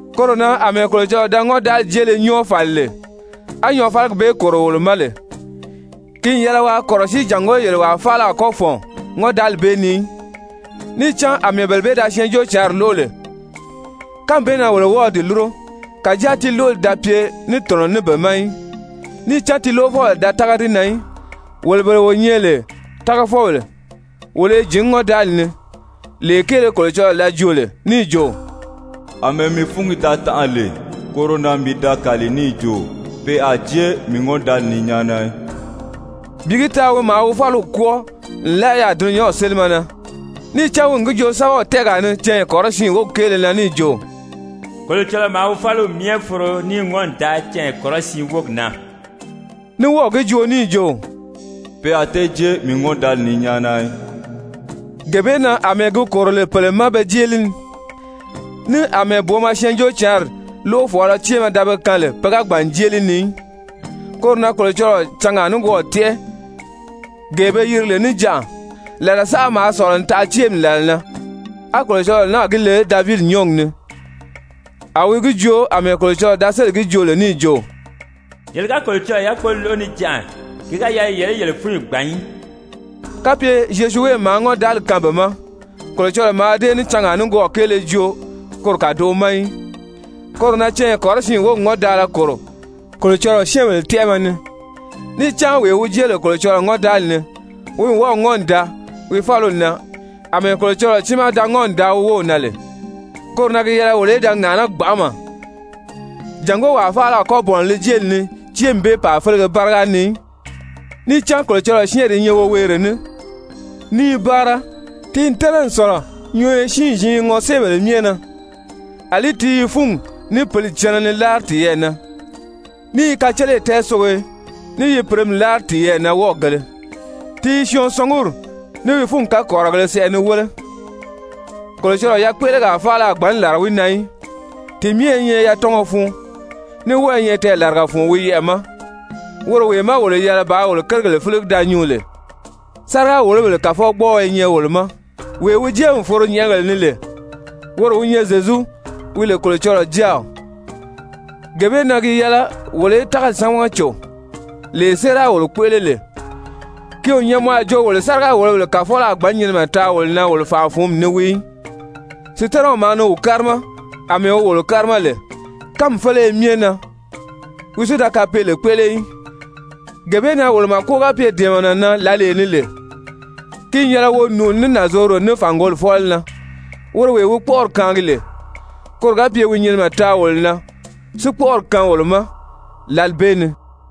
Koro na, àmɛɛ Kolocɔlɔɔ da ŋɔ́ndaali jéele nyɔ́ɔ fàli lè, á nyɔɔfaligi bee kòro wolo ma lè, ki n yɛlɛ waa kɔ̀rɔsíi jàngó yele wàa faala a kɔ́ fɔ̀n ŋɔ́ndaali bee ni í. Níì cán àmɛɛ bele bee da Syɛɛnjóocǎnri lóʔo lè, kánmi bee na wolo wɔ́ɔ̄ di lúro. Kàjáa ti lóʔoli da pye ní tɔ̀nɔ ní be ma í, níì cán ti lóʔofɔbèle da tága di na í. Wolo bele wo nyɛ lè tágafɔbèle, wolo i jǐn ŋɔ́ndaali ni, lee kéele Kolocɔlɔɔ da joo lè níì jo: «Amɛɛ mii fúngi da tanʔa lè, koro na mii da kàli níì jo pe a jée mii ŋɔ́ndaali ni nyáana í.» Bi gi taa wi maa wi fáliw kwɔ́ɔ nlaa yaà dulunyanw sélimɛ na. Níì cán wi n gi joo sɛ́bɛw tɛ́ɛgaa ni canya kɔrɔsiin wógi kéele na níì jo: «Kolocɔlɔɔ maa wi fáliw myɛ foro níì ŋɔ́n n daa canya kɔrɔsiin wógi na.» Ní wɔ́ɔ̀ gi joo níì jo: «Pe a tée jée mii ŋɔ́ndaali ni nyáana í.» Gee bee na àmɛɛ gi kòro lè pèle ma pe jée li ni, ní àmɛɛ booma Syɛɛnjóocǎnri lóʔofɔɔlɔ céemɛ da be kaan lè pe ga gbàn n jée li ni í, koro na Kolocɔlɔɔ cangaa nikwɔɔ tɛ́ʔɛ, gee be yiri lè «Níjanʔa.» Làla saʔa maa sɔ̀lɔ n taʔa céemi làla na, á Kolocɔlɔɔ náà gi le Davidi nyɔ́ɔgi ni, a wi gi joo àmɛɛ Kolocɔlɔɔ da sélì gi joo lè níì jo: «Yele ga Kolocɔlɔɔ yákpoli lóʔo níjanʔa, ki ga yɛlɛ yele í yele fúnyi gbàn í.» Kapye Zyozuwe maa ŋɔ́ndaali kaan be ma, Kolocɔlɔɔ mǎà dée ní cangaa nikwɔɔ kéele joo koro kàdoʔo ma í. Koro na canya kɔrɔsiin wógi ŋɔ́ndaala kòro Kolocɔlɔɔ syɛ́ɛnbèle tɛ́ʔɛmɛ ni. Níì cán wee wi jée lè Kolocɔlɔɔ ŋɔ́ndaali ni, wi n wɔ́ɔ̀ ŋɔ́n n daa wi fáliw na àmɛɛ Kolocɔlɔɔ tiimaa da ŋɔ́n n daa wi wów na lè. Koro na gi yɛlɛ wolo í da ŋàʔaná gbanʔama jàngó wàa faala a kɔ́ bɔ̀nɔ li jéeli ni céemi bee pàa félege báriga ni í. Níì cán Kolocɔlɔɔ syɛ́ɛnri i nyɛ woweere ní, ní i báara, ti n tɛ́nɛ n sɔ̀lɔ nyɔɔyɔ siin-ziin ŋɔséebèle myɛ na. Alí ti i fúngi ní pǐli cɛnɛ ni láari tiyɛɛ na, ní i kaceleyi tɛɛsogiyo, ní yi pìremi láari tiyɛɛ na wɔ́ɔgēle. Ti i syɔɔn sɔnguri ní wi fúngi kakɔrirɔgēle sɛʔɛ ni wéle. Kolocɔlɔɔ yakpéʔelegaa faala a gbǎn làra wi na í, ti myɛ i nyɛ yatɔngɔ fun, ní wɔ́ɔ i nyɛ tɛɛlaraga fun wi yɛʔɛ̀ ma, woro wee má wolo yɛlɛ bàā wolo kérigèle fíligi da nyuu lè. Sáriga-wòlobèle kàfɔgbɔɔɔ i nyɛ wolo ma, wee wi jée n foro nyɛ̀ʔɛgèle ni lè, woro wi nyɛ Zyezu, wi lè Kolocɔlɔɔ Jáaw, gee bee na gi yɛlɛ wolo í tágali sámaga cò, lee séera wolo kpéʔele lè. Ki o nyɛ mɔ a jo wolo sáriga-wòlobèle kàfɔlɔ a gbǎn nyinimɛ taa wòlo na wolo fànʔa-fǔnmi ni wii í. Sutanaw maa ni wi kárima àmɛɛ wi wolo kárima lè kánmi féleye myɛ na, wi si da kapeele kpéʔele í. Gee bee na wolo màko ga pye dɛ̀ɛmɛnɛ na lǎlee ni lè, ki n yɛlɛ wo nùuni ní nànzorodo ní fàngoli fɔ́lɔ na, woro wee wi kpɔ́ʔɔri kaangi lè, koro ga pye wi nyinimɛ taa wolo na si kpɔ́ʔɔri kaan wolo ma lǎli bee ni.